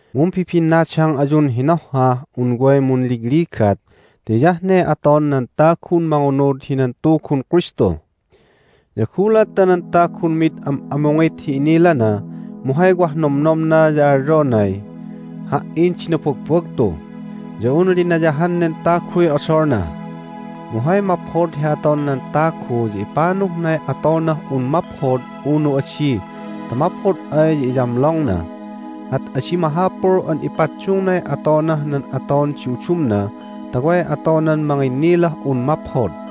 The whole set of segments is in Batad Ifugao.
Mumbibinnadang ayun hinohhah un way munligligat ti hiyah ne aton nan tagun mangunud hinan Tugun Kristu. Ya gulat ta nan tagun mid am'amungit hi inilana mu hay wah nomnomna ya alyonay, "Ha"in di nabagbagtu!" ya un linayahan nen taguy odolna. Mu hay maphod hi aton nan tagu ya ipanuhnay atonah un maphod unu adi ta maphod ay ya iyamlongna, at adi mahapul an ipaddungnay atonah nan aton di udumna ta way atonan manginnilah un maphod.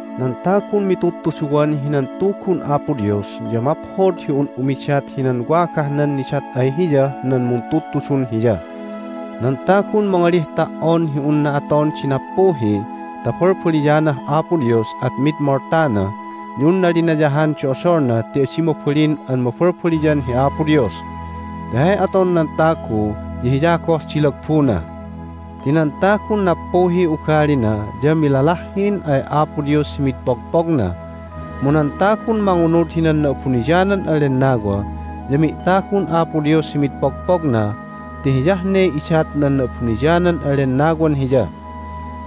Nan tagun mitudtuduwan hinan Tugun Apo Dios ya maphod hi un umidat hinan wagahnan nidat ay hiyah nan muntudtudun hiya. Nan tagun mangalih ta"on hi unna aton di nappuhi ta balbaliyanah Apo Dios at mid moltana ya unna linayahan di odolna ti adi mabalin an mabalbaliyan hi Apo Dios. Ti hay aton nan tagu ya hiya goh di lagbuna. Ti nan tagun nappuhiy ugalina ya milalahhin ay Apo Dios hi mid pogpogna, mu nan tagun mangunud hinan Na'abuniyanan an Lennawa ya mi'tagun Apo Dios hi mid pogpogna ti hiyah ne idat nan Na'abuniyanan an Lennawan hiya.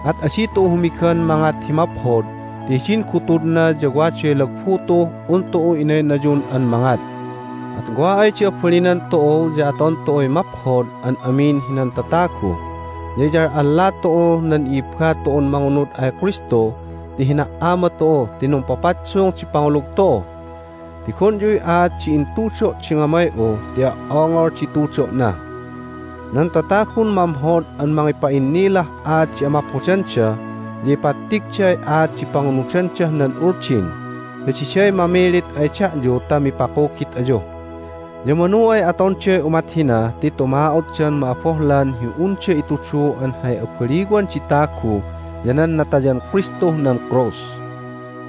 At adi tu'u humigan mangat hi maphod ti hidin gutudna ya waday lagbu tu'uh un tu'u inaynayun an mangat. At wa ay di abalinan tu'u ya aton tu'uy maphod an amin hinan tatagu, ya iyal'alla tu'uh nan i'ibba tu'un mangunud ay Kristu ti hina"ama tu'u ti numpapaddung di pangulug tu'u. Tigonyuy aat di intudo' di ngamay'u ti o"ongol di tudo'na! Nan tatagun mamhod an mangipa'innilah aat di amaphodanda ya ipattigday aat di pangunudandah nan Uldin, ya diday mamilit ay da'yu ta mipakugit ayu. Ya manu ay atonday umat hina ti tuma'otdan ma'abohlan hi unda itudu an hay abaliwan di tagu ya nan natayan Kristuh nan krus.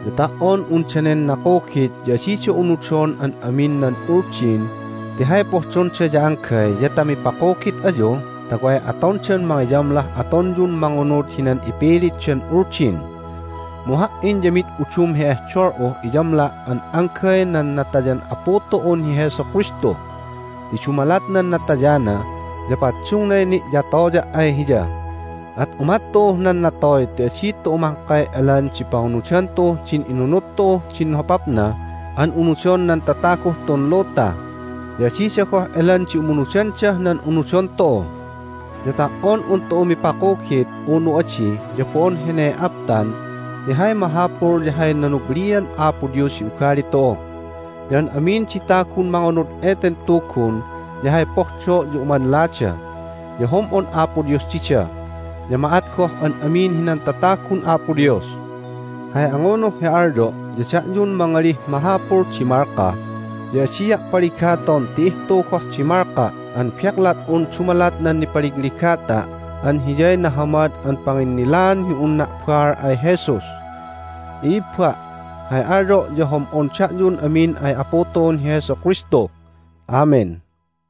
Ya ta"on un danen nakugit ya adida unudon an amin nan Uldin ti hay pohdonda ya anggay ya ta mipakugit ayu ta way atondan mangiyamlah atonyun mangunud hinan ipilitdan Uldin. Mu ha"in ya mid udum hi ehdol'uh iyamla' an anggay nan natayan Apu tu'un hi Jesu Kristu. Ti dumalat nan natayana ya paddungnay ni'yatoya' ay Hiya, at umat tu'uh nan natoy ti adi tu'u mahkay elan di pangunudan tu'uh din inunud tu'uh din hopapna an unudon nan tataguh tun luta, ya adida goh elan di umunudandah nan unudon tu'u. Ya ta"on un tu'u mipakugit unu adi, ya bo'on hene aptan ti hay mahapul ya hay nanublian Apo Dios hi ugali tu'u. Ya an amin di tagun mangunud eten Tugun ya hay pohdo' ya umanlada, ya hom'on Apo Dios dida, ya ma'at goh an amin hinan tatagun Apo Dios. Hay angunuh hi alyo' ya da'yun mangalih mahapul di malka ya adia' paligaton ti ihtu goh di malka' an beklat'un dumalat nan nipaligligata' an hiyay nahamad an panginnilaan hi unna' baal ay Jesus. I'ibba', hay alyo' ya hom'on da'yun amin ay Apu tu'un hi Jesu Kristu. Amen!